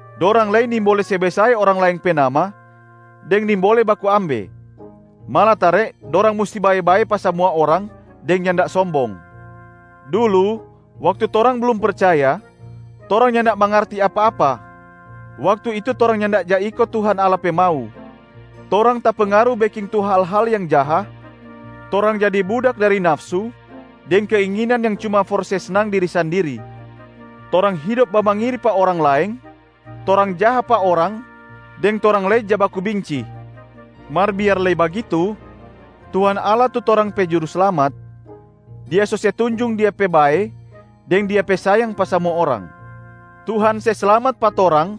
Dorang lei nimbole se besae orang laeng pe nama deng nimbole baku ambe. Malatare dorang musti bae-bae pa samua orang deng nyanda sombong. Dulu waktu torang blum percaya, torang nyanda mangarti apa-apa. Waktu itu torang nyanda ja iko Tuhan Allah pe mau, torang tapengaru beking tu hal-hal yang jaha, torang jadi budak dari nafsu deng keinginan yang cuma for se snang diri sandiri. Torang hidop bamangiri pa orang laeng, torang jaha pa orang deng torang lei ja baku binci. Mar biar lei bagitu, Tuhan Allah tu torang pe Juruslamat, Dia so se tunjung Dia pe bae deng Dia pe sayang pa samua orang. Tuhan se slamat pa torang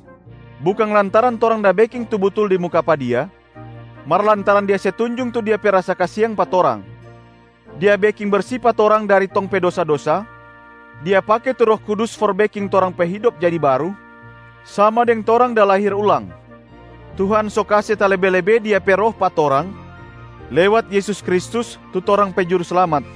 bukang lantaran torang da beking tu butul di muka pa Dia, mar lantaran Dia se tunjung tu Dia pe rasa kasiang pa torang. Dia beking bersi pa torang dari tong pe dosa-dosa, Dia pake tu Roh Kudus for beking torang pe hidop jadi baru, sama deng torang da lahir ulang. Tuhan so kase talebe-lebe Dia pe Roh pa torang lewat Yesus Kristus tu torang pe Juruslamat.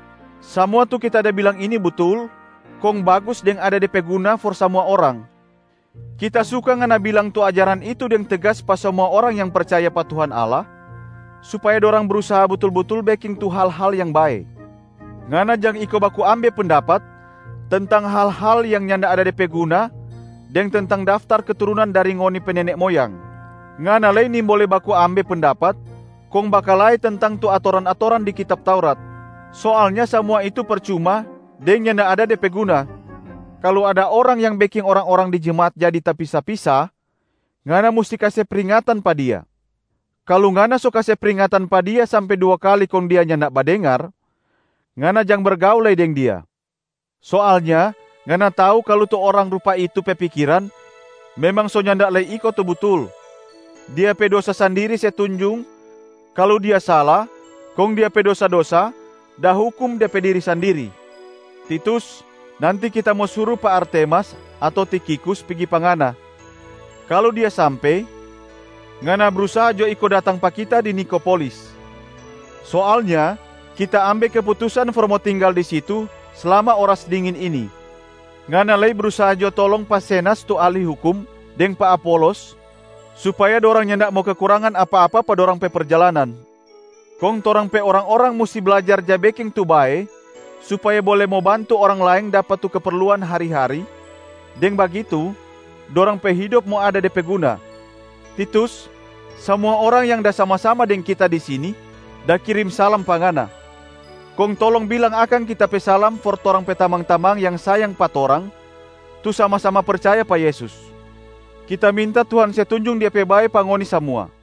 Samua tu kita da bilang ini butul, kong bagus deng ada de pe guna for samua orang. Kita suka ngana bilang tu ajaran itu deng tegas pa samua orang yang percaya pa Tuhan Allah, supaya dorang brusaha butul-butul beking tu hal-hal yang bae. Ngana jang iko baku ambe pendapat tentang hal-hal yang nyanda ada de pe guna deng tentang daftar keturunan dari ngoni pe nene moyang. Ngana lei nimbole baku ambe pendapat kong bakalae tentang tu atoran-atoran di kitab Taurat. Soalnya samua itu percuma deng nyanda ada de pe guna. Kalu ada orang yang beking orang-orang di jemaat jadi tapisa-pisa, ngana musti kase pringatan pa dia. Kalu ngana so kase pringatan pa dia sampe dua kali kong dia nyanda badengar, ngana jang bergaul lei deng dia. Soalnya ngana tau kalu tu orang rupa itu pe pikiran memang so nyanda lei iko tu butul. Dia pe dosa sandiri se tunjung kalu dia sala kong dia pe dosa-dosa da hukum de pe diri sandiri. Titus, nanti kita mo suru pa Artemas ato Tikhikus pigi pa ngana. Kalu dia sampe, ngana brusaha jo iko datang pa kita di Nikopolis. Soalnya kita ambe keputusan for mo tinggal di situ slama oras dingin ini. Ngana lei brusaha jo tolong pa Zenas tu ahli hukum deng pa Apolos supaya dorang nyanda mo kekurangan apa-apa pa dorang pe perjalanan. Kong torang pe orang-orang musti blajar ja beking tu bae supaya bole mo bantu orang laeng dapa tu keperluan hari-hari, deng bagitu dorang pe hidop mo ada de pe guna. Titus, samua orang yang da sama-sama deng kita di sini da kirim salam pa ngana. Kong tolong bilang akang kita pe salam for torang pe tamang-tamang yang sayang pa torang, tu sama-sama percaya pa Yesus. Kita minta Tuhan se tunjung Dia pe bae pa ngoni samua.